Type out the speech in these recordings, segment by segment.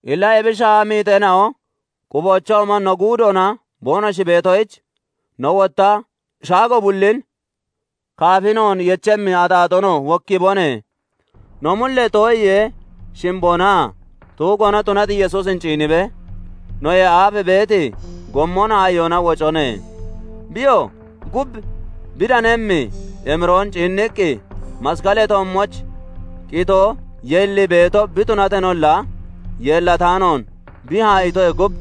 Illa ebi shaaha miixeena'o quboochoomon no guudoona boonoshi beetoyich, no wotta shaago bullin, kaafi noon yechemmi axaaxoonoo wokkiibone; no mullee too'iyee shimboonaa tuggoonon tunati Yesuusin ciinibee, noyee aaf beeti gommon haa'iyoona wocone. Biyoo gub bi danemmi emiroon ciinniqqi, masqalee toommooch qitoo yeellii beeto bi tunateenolla, yeellataanoon bi haa'iitoyee gub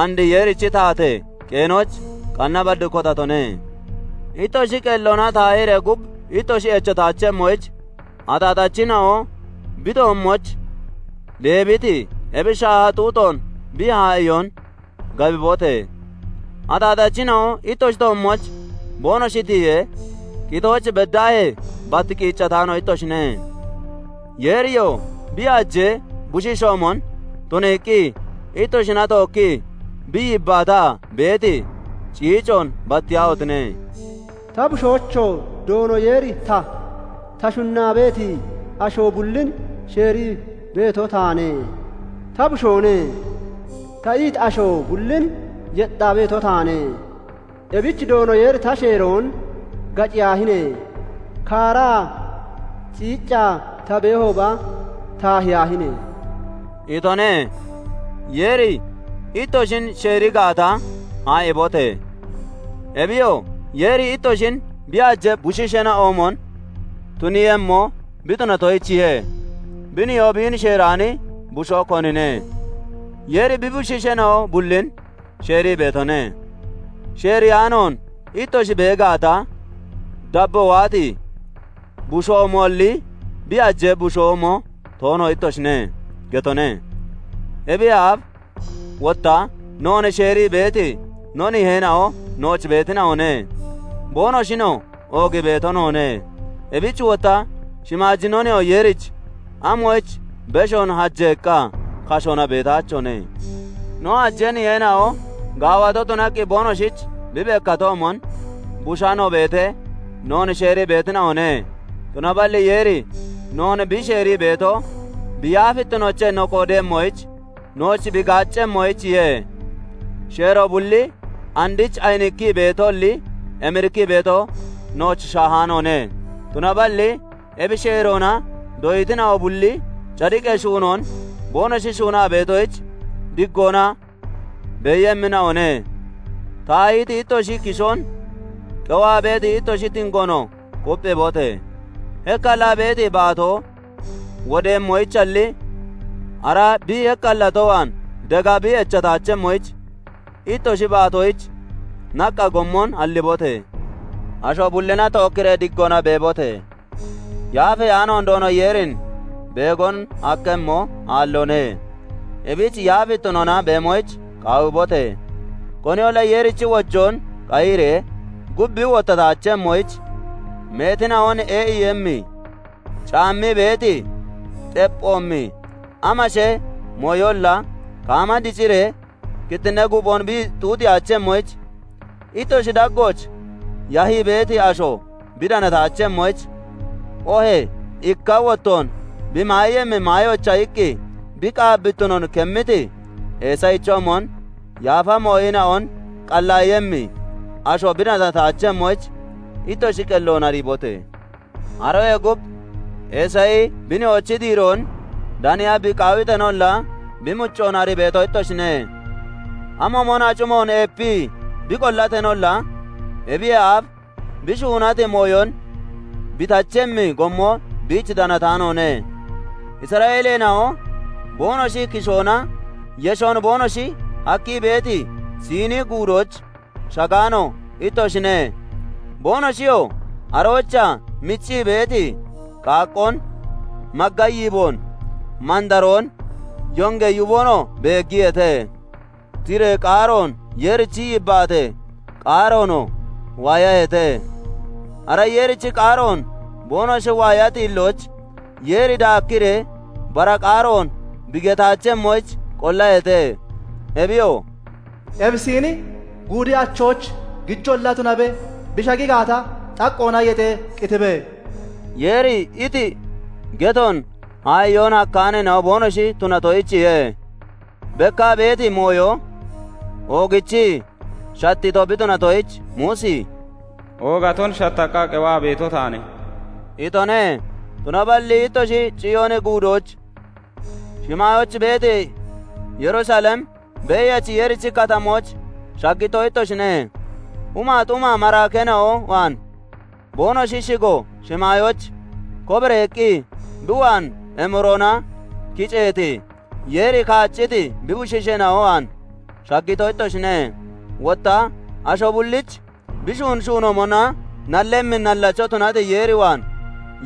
and Yeerichi taatee qeenooch qanna bad kotatone. Ittoshi qelloona taahiree gub ittoshi echataachemmoyich, axaaxachina'o bi toommooch deebiti ebi shaaha xuuxoon bi haa'iyoon gabibote! Axaaxachina'o ittoshi toommooch boonoshi tiyee, qitooch beddaahee bat qiiccataano ittoshine. Yeeriyoo bi hajee bushiishoomon tuniiqqi ittoshina tookkii bi yibbaataa beeti ciicoon battiyaahotine! "Ta bushoocho! Doono Yeeri ta, ta shunnaa beeti asho bullin sheerii beeto taane; 'Ta bushoone' ta iti asho bullin yexxaa beeto taane; Ebich Doono Yeeri ta sheeroon gaciyaahine! Kaaraa ciiccaa ta beehooba, taahiyaahine!" itone. Yeeri ittoshin sheeri gaata, haa'iibote! Ebiyoo, Yeeri ittoshin bi hajee bushiisheena'oomon tuniiyemmo bi tunatoyichiye. Bi nihoo biin sheeraani bushoo, konine? Yeeri bi bushiisheena'o bullin sheerii beetone; sheereyaanoon ittoshi bee gaata, dabboo waati bushoomoalli, bi hajee bushoomo toono ittoshine getone. Ebiyee aaf wotta noon sheerii beeti no niheena'o nooch beetina'one; boonoshinoo oogii beeto noone. Ebich wotta shimaaji no Nihoo Yeerich amoyich beshoon hajeeqqa kashoona beetaachone? No hajee niheena'o gaawato tunaqqi boonoshich bi bekkatoomon, bushaa no beetee, noon sheerii beetina'one; tunaballi Yeeri noon bi sheerii beeto, bi yaafittinoochee no qoodeeyemmoyich nooch bi gaaccemmoyichiye. Sheeroo bulli andich ayinikkii beetoalli, emirikkii beeto nooch shaahaanoone; tunaballi ebi sheeroona doyitina'o bulli cadiqee shuunoon boonoshi shuunaa beetoyich diggoona beeyemmina'one. Taahiti ittoshi kishoon, qewaa beeti ittoshi tingoonoo kupphiibote! Hekkallaa beeti baatoo wodemmoyichalli, ara bi hekkallato waan dega bi echataachemmoyich, ittoshi baatoyich naqqa gommon hallibote! Asho bullina tookki diggoona beebote! Yaafeyaanoon Doono Yeerin beegon hakkemmo aalloone; ebich yaafittinoona beemoyich qaawibote! Koniyolla Yeerichi wojoon qayiree gub bi wottataachemmoyich, meetina'on ee'iiyemmi, caammii beeti xepphoomi amashee mooyolla kaama diciree kittinnee guuphon bi xuuxiyaachemmoyich, ittoshi daggooch yahii beeti asho bi danataachemmoyich, oohee ikka wottoon bi maayemmi maayoyicha iqqi bi qaabbittinoon kemmiti Eesayichoomon, yaafa mooyina'on qallaayemmi asho bi danataachemmoyich, ittoshi qelloon ariibote! Aroyee gub Eesayi bi nihoochi diiroon daniya bi qaawiteenolla, bi muccoon arii beeto ittoshine; amoomon acimoon eepii bi qollateenolla, ebiyee aaf bi shuunati mooyon bi tachemmi gommo biich danataanoone. Isra'eeleena'o boonoshi kishoona yeshon boonoshi hakkii beeti Siini Guudooch shagaano ittoshine; boonoshiyoo aroochaa miccii beeti qaaqqoon, magga yiiboon, mandaroon, yongee yuboonoo beeggiyeete; tiree qaaroon Yeerichi yibbaatee qaaroonoo waayaheete. Ara Yeerichi qaaroon boonoshi waayati hillooch Yeeri daakkiree bara qaaroon bi getaachemmoyich qollaheete. Ebiyoo, "Ebi Siini Guudi achooch gijolla tunabe bi shagi gaata, xaqqoona yexee qitibe" Yeeri iti getoon haa'iyoon hakkaaneena'o boonoshi tunatoyichiye. Bekkaa beeti mooyo oogichii shattiito bi tunatoyich, Muusi "Oogaton shattaqqa qewaa beeto taane" itone. Tunaballi ittoshi Ciyooni Guudooch, shimaayooch beeti Yerusalem, Beeyachi Yeerichi katamooch shaggito ittoshine; humaa xuma maraakeena'o waan, boonoshi shigo shimaayooch kobareeqqi bi waan emiroona kiceeti, Yeeri kaacciti bi bushiisheena'o waan shaggito ittoshine; wotta asho bullich bi shuuni shuunoomona nallemmi nallacho tunati Yeer waan,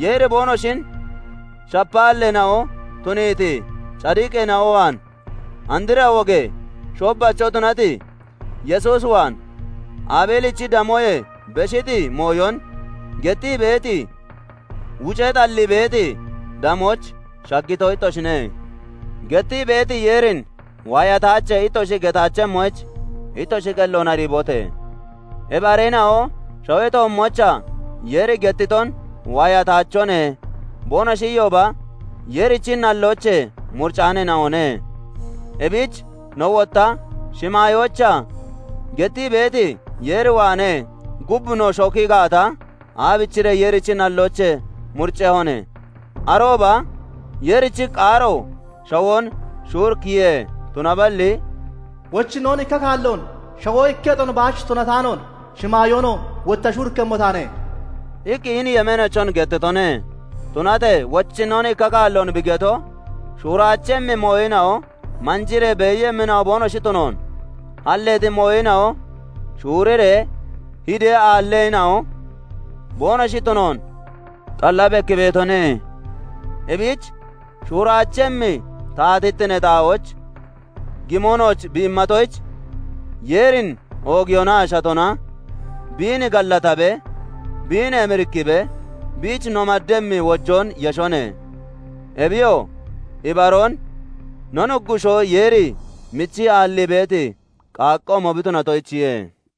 Yeeri boonoshin shapaalleena'o tuniiti cadiqeena'o waan, andra wogee shoobbacho tunati Yesuus waan, Abeelichi damoyee beshiti mooyon gettii beeti, wucee xallii beeti damooch shaggito ittoshine. Gettii beeti Yeerin "Waayataache" ittoshi getaachemmoyich ittoshi qelloon ariibote! Ebi areena'o shawee toommoochaa Yeeri gettiton "Waayataachone" boonoshi iyooba, Yeerichi nalloochee muricaaneena'one; ebich no wotta shimaayoochaa gettii beeti Yeer waanee gub no shoki gaata, aabichiree Yeerichi nalloochee muriccehone? Arooba Yeerichi qaaro shawoon shuurikkiye; tunaballi "Wochinnoon ikka kaalloon shawoo ikketon baach tunataanoon, shimaayoonoo wotta shuurikkemmo taane" iqqi hini yemeeneechon gettitone. Tunatee Wochinnoon ikka kaalloon bi geto, shuuraachemmi mooyina'o manjiree beeyemmina'o boonoshi tunoon, halleeti mooyina'o shuuriree hidee aallemmina'o boonoshi tunoon xalla bekkii beetone. Ebich shuuraachemmi taatittinee xaa'ooch gimo nooch bi immatoyich, Yeerin oogiyoonaa shatona biin gallatabee, biin emirikkibee biich no maddemmi wojoon yeshone; Ebiyoo, ibaroon no Nuggushoo Yeeri michii aallii beeti qaaqqoomo bi tunatoyichiye.